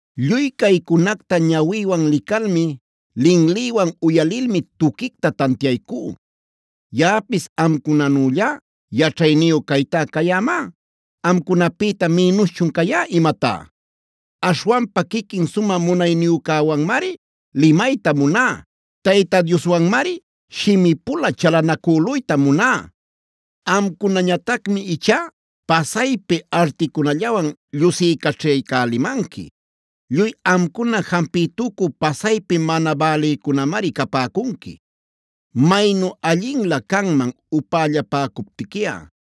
“Lluy caycunacta ñawïwan licalmi, linlïwan uyalilmi tuquicta tantiaycú. Yaꞌapis amcunanüllá yaćhayniyu caytá cayämá. ¿Amcunapïta minuschun cayá imatá? Aśhwanpa quiquin Sumä Munayniyücäwanmari limayta muná; Tayta Dioswanmari shimi-pula chalanacüluyta muná. Amcunañatacmi ichá pasaypi articunallawan llusicaćhaycälimanqui. Lluy amcuna jampicütucü pasaypi mana bälïcunamari capäcunqui. Maynu allinlä canman upällapäcuptiquiꞌa.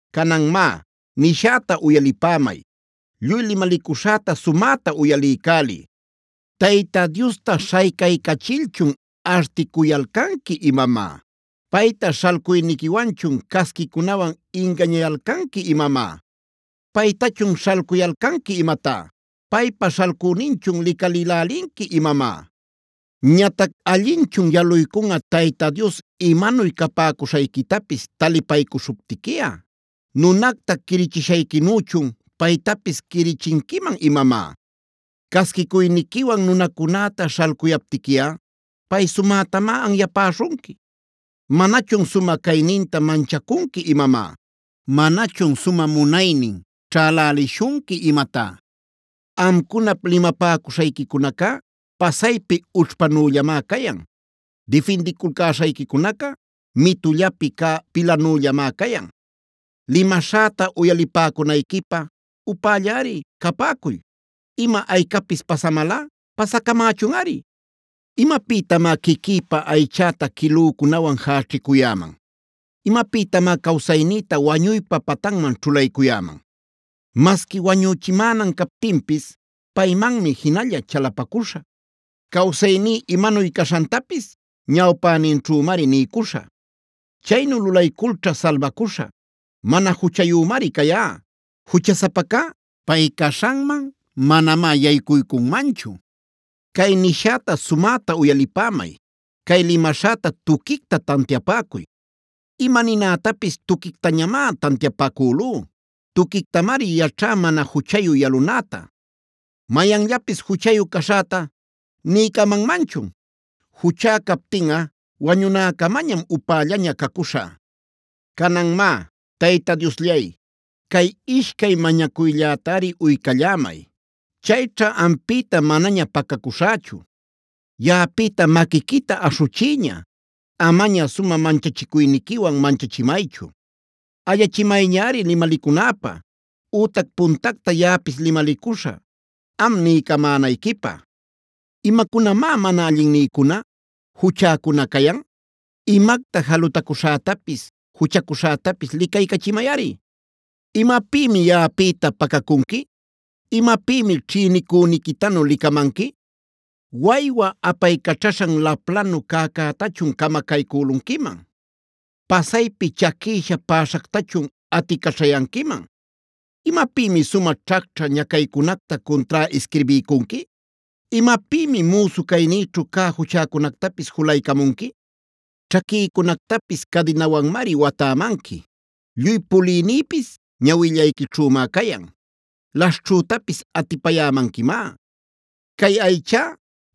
Canan má, nishäta uyalipämay; lluy limalicuśhäta sumäta uyaliycäliy. “¿¡Tayta Diosta śhaycaycachilchun articuyalcanqui imamá!? ¿¡Payta śhalcuyniquiwanchun casquicunawan ingañayalcanqui imamá!? ¿¡Paytachun śhalcuyalcanqui imatá!? ¿¡Paypa śhalcüninchun licalilälinqui imamá!? Ñatac ¿allinchun yaluycunꞌa Tayta Dios imanuy capäcuśhayquitapis talipaycuśhuptiquiꞌa? ¿¡Nunacta quirichishayquinüchun paytapis quirichinquiman imamá!? Casquicuyniquiwan nunacunäta śhalcuyaptiquiꞌa pay sumätamá anyapäśhunqui. ¿¡Manachun sumä cayninta manchacunqui imamá!? ¿¡Manachun sumä munaynin ćhälälishunqui imatá!? Amcunap limapäcuśhayquicunacá pasaypi ućhpanüllamá cayan; difindiculcäśhayquicunaca mitullapi cä pilanüllamá cayan. “Limaśhäta uyalipäcunayquipä upällari capäcuy, ima aycapis pasamalꞌa pasacamächunꞌari. ¿Imapïtamá quiquïpa aychäta quilücunawan jäćhicuyäman? ¿Imapïtamá cawsaynïta wañuypa patanman ćhulaycuyäman? Masqui wañuchimänan captinpis paymanmi jinalla chalapacuśhä; cawsayní imanuy caśhantapis ñawpäninćhümari niycuśhä. Chaynu lulayculćha salbacuśhä; mana juchayümari cayá. Juchasapacá pay caśhanman manamá yaycuycunmanchu. “Cay nishäta sumäta uyalipämay; cay limaśhäta tuquicta tantiapäcuy. Ima ninätapis tuquictañamá tantiapacülú; tuquictamari yaćhá mana juchayu yalunäta. ¿Mayanllapis juchayu caśhäta niycamanmanchun? Juchá captinꞌa wañunäcamañam upällaña cacuśhä. “Canan má, Tayta Diosllay, cay ishcay mañacuyllätari uycallämay; chayćha ampïta manaña pacacuśhächu: Yaꞌapïta maquiquita aśhuchiyña; amaña sumä manchachicuyniquiwan manchachimaychu. Ayachimayñari limalicunäpä; ütac puntacta yaꞌapis limalicuśhä, am niycamänayquipä. ¿Imacunamá mana allinnïcuna, juchäcuna cayan? Imacta jalutacuśhätapis, juchacuśhätapis licaycachimayꞌari. ¿Imapïmi yaꞌapïta pacacunqui?b ¿Imapïmi ćhïnicüniquitanu licamanqui? ¿Waywa apaycaćhaśhan laplanu cäcätachun camacaycülunquiman? ¿Pasaypi chaquïsha päśhactachun aticaćhayanquiman? ¿Imapïmi sumä ćhacćhä ñacaycunacta cuntrá isquirbiycunqui? ¿Imapïmi müsu caynïćhu cä juchäcunactapis julaycamunqui? Ćhaquïcunactapis cadinawanmari watämanqui, lluy pulïnïpis ñawillayquićhümá cayan, laśhćhütapis atipayämanquimá. Cay aychá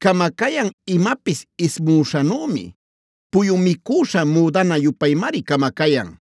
camacayan imapis ismüśhanümi, puyu micüśha müdana-yupaymari camacayan.